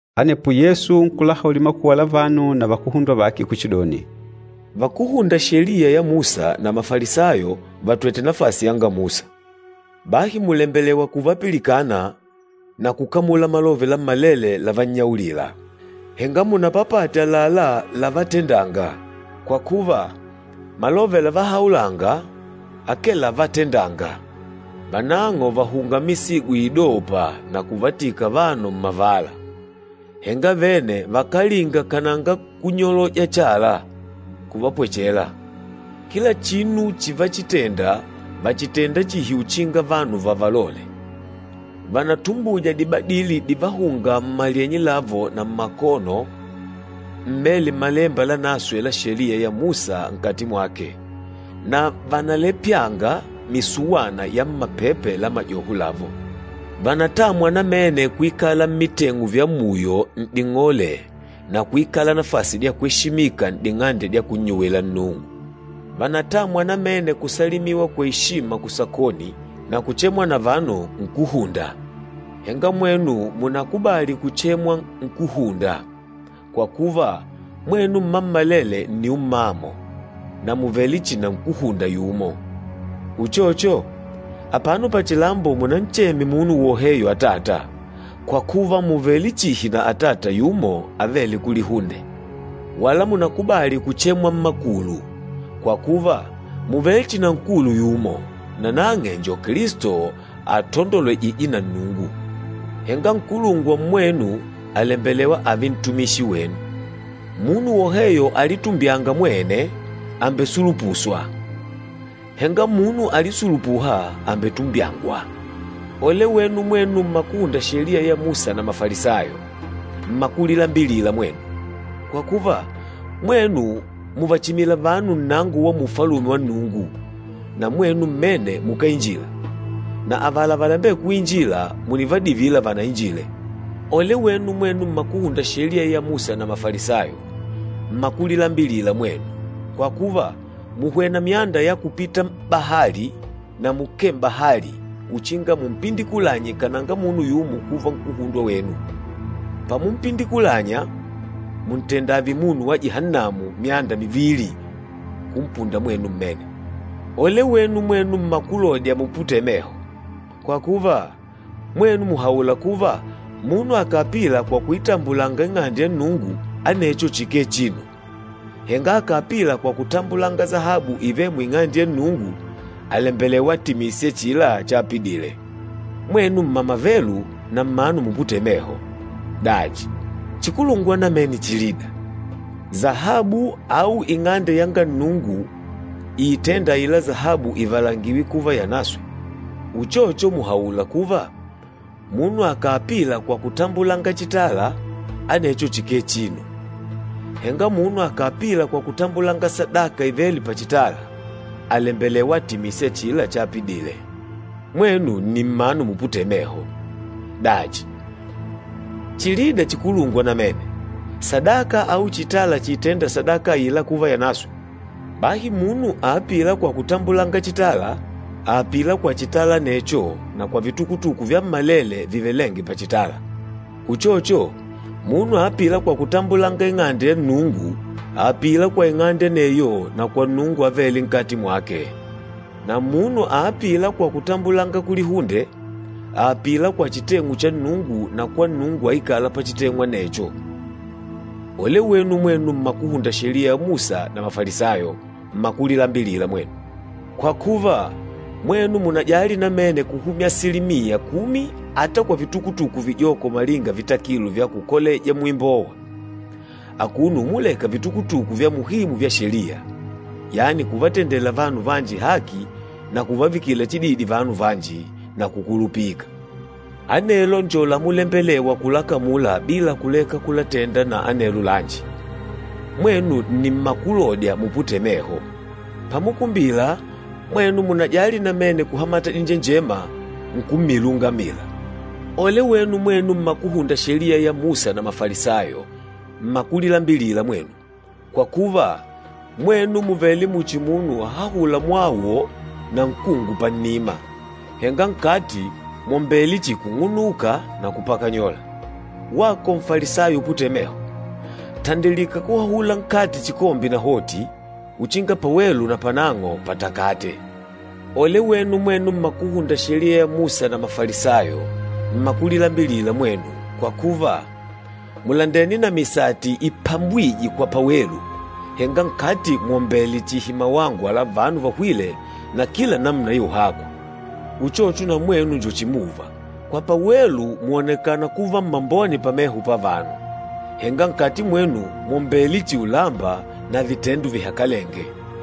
Anepo Yesu nkulahaulila makuwa la vanu na vakuhundwa vake kuchidoni, “Vakúhunda Sheliya ya Musa na Mafalisayo vatwête nafasi yanga Musa. Bahi mùlembelewa kuvapilikana na kukamula malove lammalele lavannyaulila, henga munapapate àlalá lávatendàngà, kwa kuva malove lavahaulanga akee lávatendàngà. Vanang'o vàhunga misigo iidôpa na kuvatika vanu mmavala, henga vene vakálinga kananga kunyoloja chala kuvapwechela. Kila chinu chivachitenda vàchitenda chihi uchinga vanu vavalole. Vànatumbuja dibadili divahûnga mmalyenye lavo na mmakono, mmêle Malemba Lanaswe la Sheliya ya Musa nkati mwake, na vànalepyanga misuwana ya mmapepe la majoho lavo. Vànatamwa namene kuikala mmiteng'u vya muyo n'ding'ole na kuikala nafasi dya kweshimika n'ding'ande dya kunnyuwila Nnungu. Vànatamwa namene kusalimiwa kwa eshima kusakoni na kuchemwa na vanu, ‘Nkúhunda.’ Henga mwenu mùnakubali kuchemwa ‘Nkúhunda,’ kwa kuva mwenu mmammalele nni ummamo, na mùvele chihi na nkúhunda yumo. Uchocho, apano pachilambo munancheme munu woheyo ‘Atata’ kwa kuva mùvele chihi na Atata yumo, avêle kulihunde. Wala munakubali kuchemwa ‘Mmakulu,’ kwa kuva mùvele chihi na nkulu yumo, nanang'e njo Kilisto atandolwejîje na Nnungu. Henga nkulungwa mmwenu, àlembelewa ààve ntumishi wenu. Munu woheyo alitumbyânga mwene, àmbesulupuswa, henga munu alisulupûha, àmbetumbyangwa.” “Ole wenu mwenu mmakuhunda Sheliya ya Musa na Mafalisayo, mmakulilambilila mwenu! Kwa kuva, mwenu mùvachimila vanu nnango wa mu Ufalume wa Nnungu, na mwenu mmene mukáinjila, na avala valembêla kuinjila mùnivadivila vanainjile. Ole wenu mwenu mmakuhunda Sheliya ya Musa na Mafalisayo, mmakulilambilila mwenu! Kwa kuva, mùhwena myanda ya kupita m'bahali na mukee m'bahali uchinga mumpindikulanye kananga munu yumo kuva nkúhundwa wenu. Pamumpindikulanya, mùntenda ààve munu wa Jihannamu myanda mivili kumpunda mwenu mmene. Ole wenu mwenu mmakulodya muputêle meho! Kwa kuva, mwenu mùhaula kuva munu akàapila kwa kuitambulanga Ing'ande ya Nnungu, anecho chikee chinu, henga akàapila kwa kutambulanga sahabu ivêle mu Ing'ande ya Nnungu, àlembelewa atimise achila chaapidile. Mwenu m̀mamavelu na mmanu muputêle meho! Dachi, chikulungwa namene chilida, sahabu au Ing'ande yanga Nnungu iitênda aila sahabu ivalangiwe kuva yanaswe? Uchocho mùhaula kuva, ‘Munu akàapila kwa kutambulanga chitala, anecho chikee chinu, henga munu akàapila kwa kutambulanga sadaka ivêle pachitala, àlembelewa atimise achila chaapidile.’ Mwenu nni mmanu muputêle meho! Dachi, chilida chikulungwa namene, sadaka au chitala chiitênda sadaka aila kuva yanaswe? Bahi munu aapîla kwa kutambulanga chitala, àapila kwa chitala anecho na kwa vitukutuku vyammalele vivelênge pachitala. Uchocho, munu aapîla kwa kutambulanga Ing'ande ya Nnungu, àapila kwa ing'ande aneyo na kwa Nnungu avêle nkati mwake. Na munu aapîla kwa kutambulanga kulihunde, àapila kwa chiteng'u cha Nnungu na kwa Nnungu aikâla pachiteng'u anecho. Ole wenu mwenu mmakuhunda Sheliya ya Musa na Mafalisayo, mmakulilambilila mwenu! Kwa kuva, mwenu mùnajali namene kuhumya asilimiya kumi ata kwa vitukutuku vijoko malinga vitakilo vya kukoleja muimbowa, akuno umulekanga vitukutuku vya muhimu vya Sheliya, yani kuvatendela vanu vanji haki na kuvavikila chididi vanu vanji, na kukulupika. Anelo njo lamulembelewa kulakamula bila kuleka kulatenda na anelo lanji. Mwenu nni mmakulodya muputêle meho! Pamukumbila, mwenu mùnajali namene kuhamata dinjenjema nkummila ungamila. Ole wenu mwenu mmakuhunda Sheliya ya Musa na Mafalisayo, mmakulilambilila mwenu! Kwa kuva, mwenu mùvele muchi munu àhahula mwawo na nkungu pannima, henga nkati mwòmbele chihi kung'unuka na kupakanyola. Wako Nfalisayo uputêle meho! Tandilika kuhahula nkati chikombe nahoti, uchinga pawelu napanang'o patakate. Ole wenu mwenu mmakuhunda Sheliya ya Musa na Mafalisayo, mmakulilambilila mwenu! Kwa kuva, mùlandene na misati ipambwîje kwa pawelu, henga nkati mwòmbele chihi mawangwa la vanu vahwîle na kila namuna ya uhakwa. Uchocho na mwenu njo chimuva, kwa pawelu mwònekana kuva mmambone pameho pavanu, henga nkati mwenu mwòmbele chihi ulamba na vitendo vihakalenge.”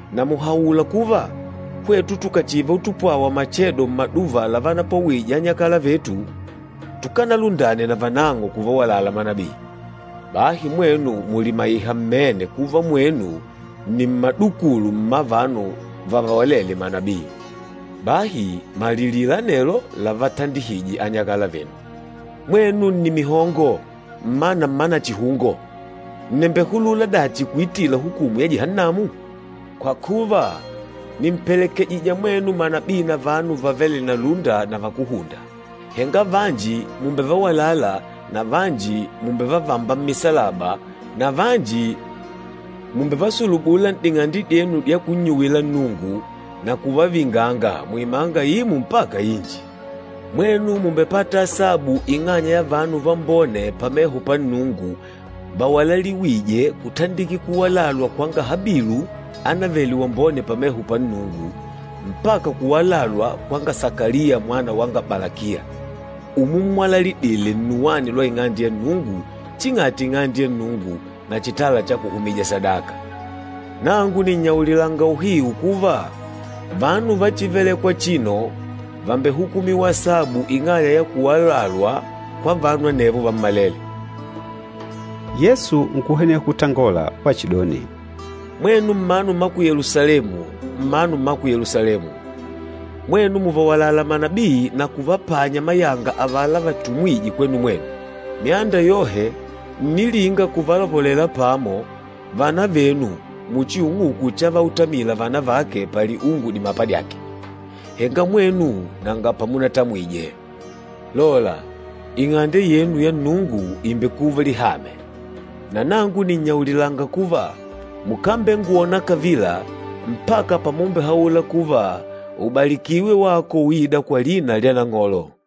na mùhaula kuva, ‘Hwetu tukachiva utupwawa machedo mmaduva lavanapwawije anyakala vetu, tukanalundane navanang'o kuvawalala manabii.’ Bahi mwenu mùlimaiha mmene kuva mwenu nni mmadukulu mma vanu vavawalêle manabii. Bahi malilila anelo lavatandihije anyakalavenu! Mwenu nni mihongo, mmana mma nachihungo! Ǹnembehulula dachi kuitila hukumu ya Jihannamu? Kwa kuva, nìmpelekejija mwenu manabii na vanu vavêle na lúnda na vakúhunda. Henga vanji mùmbevawalala na vanji mùmbevavamba mmisalaba na vanji mùmbevasulubula n'ding'ande dyenu dya kunnyuwila Nnungu na kuvavinganga muimanga imo mpaka inji. Mwenu mùmbepata asabu ing'anya ya vanu vambone pameho pa Nnungu vawalaliwîje, kutandikila kuwalalwa kwanga Habilu ánavele wambone pameho panga Nnungu, mpaka kuwalalwa kwanga Sakaliya mwana wanga Balakiya, umummwalalidile nnuwani lwa Ing'ande ya Nnungu ching'ati Ing'ande ya Nnungu na chitala cha kuhumija sadaka. Nangu nìnnyaulilanga uhiu kuva, vanu va chívelèkwà achino vàmbehukumiwa asabu ing'anya ya kuwalalwa kwa vanu anevo vammalele.” Yesu nkuhweneha kutangola wachidoni, “Mwenu mmanu mma ku Yelusalemu, mmanu mma ku Yelusalemu! Mwenu mùvawalala manabii na kuvapanya mayanga avala vatumwîje kwenu mwenu. Myanda yohe ǹnilinga kuvalopolela pamo vana venu muchi ung'uku chavautamila vana vake paliungu dimapa dyake, henga mwenu nanga pamutamwije. Lola, Ing'ande yenu ya Nnungu ìmbekuva lihame. Na nangu nìnnyaulilanga kuva, mukambengwona kavila mpaka pamumbehaula kuva, ‘Ubalikiwe wako uîda kwa lina lya Nang'olo.’”